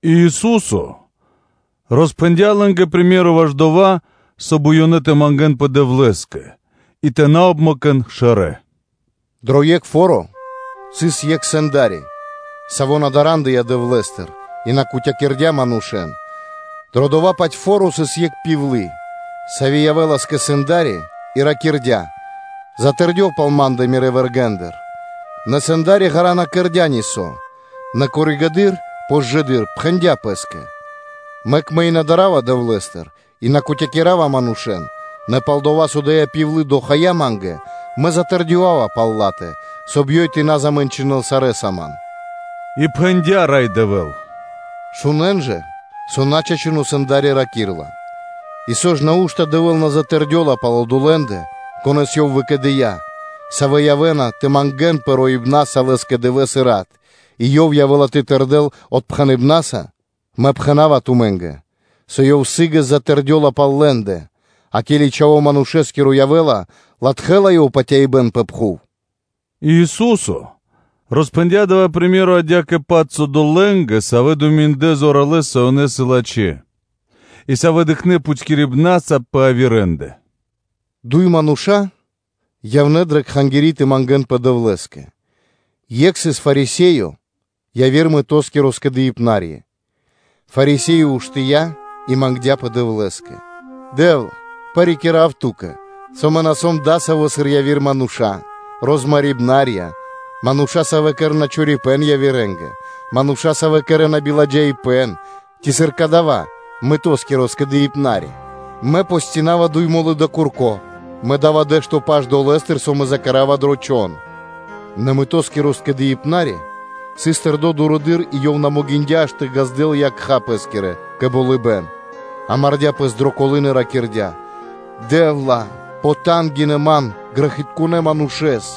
И Ису́со роспхэндя́ лэ́нгэ приме́ро (сыкаибэ́н) ваш дова́, соб (кай) ёнэ тэ мангэ́нпэ Дэвлэ́скэ и тэ на обмэкэн шэрэ́: “Дро екх фо́ро сыс екх сэнда́ри, саво́ на дарандыя Дэвлэ́стыр и на кутякирдя манушэ́н; дро дова́-паць фо́ро сыс екх пивлы (удова), сави́ явэ́лас кэ сэнда́ри и ракирдя́: ‘Затэрдёв пал ма́ндэ Мирэ́ вэргэ́ндыр!’ Нэ сэнда́ри ґара́ (длу́гэс) на кэрдя́ нисо́, нэ коригэды́р (позжэды́р) пхэндя́ пэ́скэ: ‘Мэк мэ и на дарава Дэвлэ́стыр и на кутякирава манушэ́н, нэ пал-дова́ со ада́я пивлы дохая ма́нгэ, мэ затырдёвава пал ла́тэ, соб (кай) ёй тэ на замэнчынэл сарэ́са ман!’ И пхэндя́ Рай Дэвэ́л: “Шунэ́н жа, со начачуно сэнда́ри раки́рла. И со ж, нау́што Дэвэ́л на затырдёла пал одолэ́ндэ, конэ́с Ёв выкэдыя́, савэ́ явэ́на тэ мангэ́нпэ роибнаса Лэ́скэ дывэ́с и рат, и Ёв явэ́ла тэ тырдэл отпхэныбнаса? Мэ пхэна́ва тумэ́нгэ, со Ёв сы́гэс затэрдёла пал лэ́ндэ. А ке́ли Чхаво́ Манушэ́скиро явэ́ла, ци латхэ́ла Ёв патяибэ́н пэ пхув?” И Ису́со роспхэндя́ дава́ приме́ро (сыкаибэ́н) адя́кэ-паць одолэ́нгэ, савэ́ думиндлэ зоралэ́с, со ёнэ сыс лачхэ́ и, савэ́ дыкхнэ́ пхутькирибнаса пэ явирэндэ: “Дуй мануша́ явнэ́ дрэ кхангири́ тэ мангэ́нпэ Дэвлэ́скэ; екх сыс Фарисеё, яви́р мытоскиро скэдыибнари. Фарисее уштыя́ и мангдя́пэ Дэвлэ́скэ: ‘Дэ́вла, парикира́в Ту́кэ, со мэ на сом адасаво́, сыр яви́р мануша́: розмарибнарья; мануша́, савэ́ кэрэ́на биба́хт явирэ́нгэ; мануша́, савэ́ кэрэ́на биладжаипэ́н; ци сыр кадава́ мытоскиро скэдыибнари. Мэ постинава дуй мо́лы дро курко, мэ да́ва дэ́што паш долэ́стыр, со мэ закэрава дро чхон.’ Нэ мытоскиро скэдыибнари сыс тэрдо́ дурэды́р и ёв на могиндя́ аж тэ ґаздэл якха́ пэ́скирэ кэ болыбэ́н, а мардя пэс дро колы́н и ракирдя́: ‘Дэ́вла! Потангинэ ман, грэхитконэ́ манушэ́с’.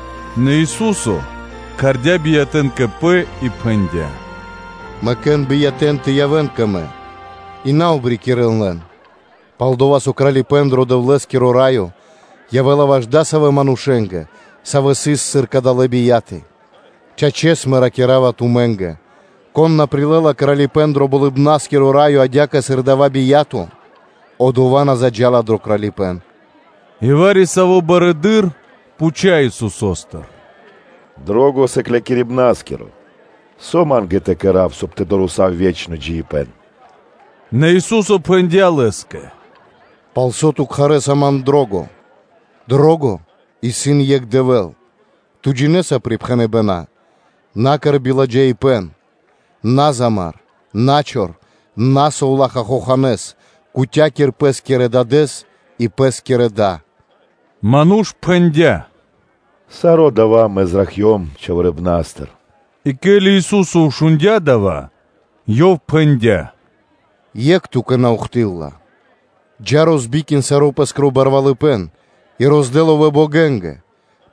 Нэ Ису́со кхардя́ биятэ́н кэ Пэ и пхэндя́: “Мэкэ́н биятэ́н тэ явэ́н кэ Мэ, и на обрикирэн лэн, пал-дова́ со Кралипэ́н дро Дэвлэ́скиро Раё явэ́ла ваш адасавэ́ манушэ́нгэ, савэ́ сыс сыр кадалэ́ бияты. Чачэс, Мэ ракира́ва тумэ́нгэ: кон на прилэ́ла Кралипэ́н дро Болыбна́скиро Раё адя́кэ, сыр адава́ бия́то, одова́ на заджа́ла дро Кралипэ́н.” И вари-саво́ барыдыро́ пхуця́ Исусо́стыр: “Лачхо́ Сыклякирибна́скиро! Со ма́нгэ тэ кэра́в, соб (кай) тэ дорэсав ве́чно джиибэ́н?” Нэ Ису́со пхэндя́ Лэ́скэ: “Палсо́ ту кхарэса ман ‘Лачхо́?’ Нико́н исын лачхо́. Лачхо́ исын екх Дэвэ́л. Ту джинэ́са припхэныбэна́: ‘На кэр биладжаипэ́н, на замар, на чор, на совлаха́ хоханэ́с; кутякир пэ́скирэ дадэ́с и пэ́скирэ да.’ Ману́ш пхэндя́: “Саро́ дава́ мэ зракхцём чхаворипнастыр.” И ке́ли Ису́со шундя́ дава́, Ёв пхэндя́: “Екх ту́кэ на ухты́лла (на́доси): джа́, розбикин саро́ пэ́скиро барвалыпэ́н, и роздэ ловэ́ богэнгэ,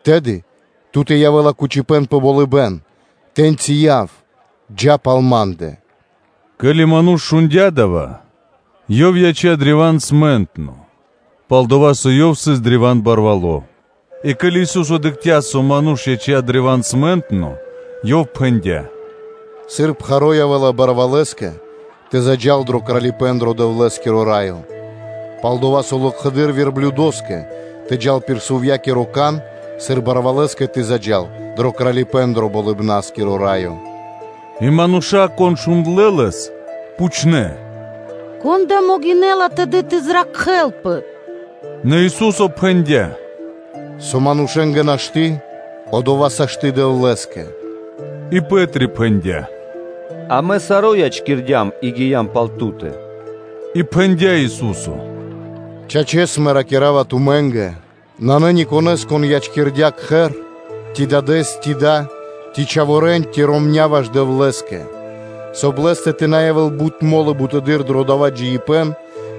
тэды ту́тэ явэ́ла кучипэ́н пэ болыбэ́н; тэ́ньчи яв, джа́ пал Ма́ндэ.” Ке́ли ману́ш шундя́ дава́, ёв яця́ древа́н смэнтно, пал-дова́ со ёв сыс древа́н барвало́. А ке́ли Ису́со дыкхця́, со ману́ш яця́ древа́н смэнтно, ёв пхэндя́: “Сыр пхаро́ явэ́ла барвалэскэ тэ заджа́л дро Кралипэ́н дро Дэвлэ́скиро Раё; пал-дова́ со локхэды́р верблюдоскэ тэ джал пир сувьякиро кан, сыр барвалэскэ тэ заджа́л дро Кралипэ́н дро Болыбна́скиро Раё.” И мануша́, кон шундлэ́ Лэс, пхучнэ́: “Кон да могинэ́ла тэды тэ зракхэлпэ?” Нэ Ису́со пхэндя́: “Со манушэ́нгэ нашты́, одова́ сашты́ Дэвлэ́скэ.” И Пэ́три пхэндя́: “Амэ саро́ ячкирдям и гиям пал Ту́тэ.” И пхэндя́ Ису́со: “Чачэс, Мэ ракира́ва тумэ́нгэ: нанэ никонэ́с (нанэ нико́н), кон ячкирдя́ кхэр, ци дадэ́с, ци да, ци чхаворэ́н, ци ромня́ ваш Дэвлэ́скэ, соб (кай) лэ́стэ тэ на явэ́л бут мо́лы бутэды́р дро дава́ джиибэ́н,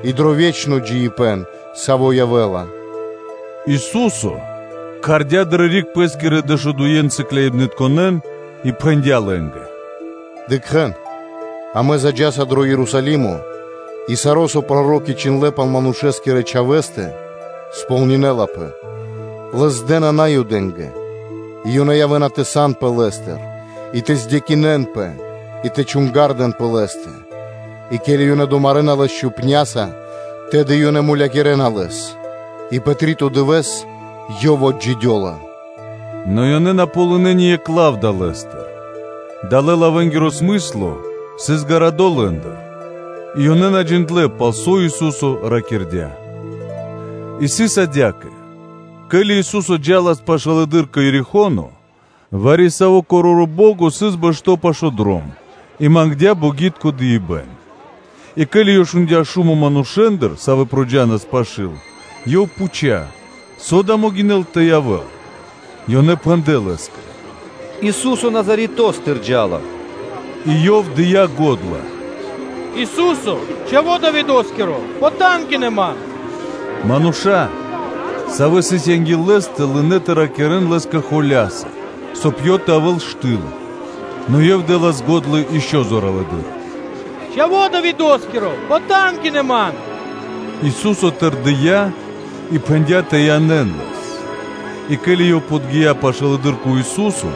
и дро ве́чно джиибэ́н, саво́ явэ́ла.” Ису́со кхардя́ дрэ риг Пэ́скирэ дэшудуе́ сыкляибнытконэ́н и пхэндя́ лэ́нгэ: “Дыкхэ́н, амэ заджаса дро Ерусалимо, и саро́, со проро́ки чхиндлэ́ пал Манушэ́скирэ Чхавэ́стэ, кэрэ́лапэ кэ ко́нцо/яго́ро (сполнинэлапэ); Лэс дэ́на дро васта́ (здэна) Наюдэ́нгэ; и ёнэ явэ́на тэ санпэ холямэс Лэ́стыр, и тэ ладжакирэн, и тэ чунгардэн пэ Лэ́стэ. И ке́ли ёнэ домарэна Лэс, тэды ёнэ мулякирэна Лэс; и пэ три́то дывэ́с Ёв отджидёла.” Нэ ёнэ на ґалынэ́ ни екх лав далэ́стыр. Далэ́-лавэнгиро смысло сыс ґарадо лэ́ндыр, и ёнэ на джиндлэ́, пал со Ису́со ракирдя́. И сыс адя́кэ: ке́ли Ису́со джа́лас пашылэды́р кэ Ерихо́но, вари-саво́ короро́ бо́го сыс бэшто́ пашы́л дром и мангдя́ богитко дыибэ́н. И ке́ли ёв шундя́ шумо манушэ́ндыр, савэ́ джа́нас пашы́л, ёв пхуця́, со дава́ могинэл тэ явэ́л? Ёнэ пхэндлэ́ лэ́скэ: “Ису́со Назаретостыр джа́ла.” И ёв дыя́ го́дла: “Ису́се, Чхаво́ Давидо́скиро! Потангинэ (пожалин) ман!” Мануша́, савэ́ сыс анги́л лэ́стэ, лынэ́ тэ ракирэ́н лэ́скэ холя́са, соб (кай) ёв тэ явэ́л штыл, нэ ёв дэ́лас го́дла ишчо (инкэ́) зоралэды́р: “Чхаво́ Давидо́скиро! Потангинэ ман!” Ису́со тэрдия́ и пхэндя́ тэ янэ́н лэс. И ке́ли ёв подги́я пашылэды́р кэ Ису́со,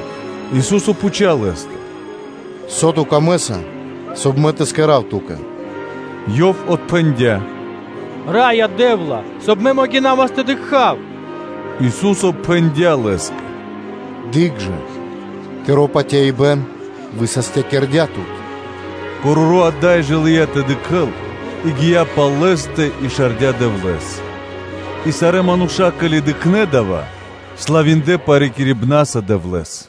Ису́со пхуця́ лэ́стыр: “Со ту камэ́са, соб (кай) Мэ тэ кэра́в ту́кэ?” Ёв отпхэндя́: “Раё Дэ́вла, соб (кай) мэ могинавас тэ дыкха́в.” Ису́со пхэндя́ Лэ́скэ: “Дыкх жа: тыро́ патяибэ́н высастякирдя́ тут.” Короро́ ада́й жэ лыя́ тэ дыкхэ́л и гия́ пал Лэ́стэ, и шардя Дэвлэ́с. И сарэ́ мануша́, ке́ли дыкхнэ́ дава́, славиндлэ парикирибнаса Дэвлэ́с.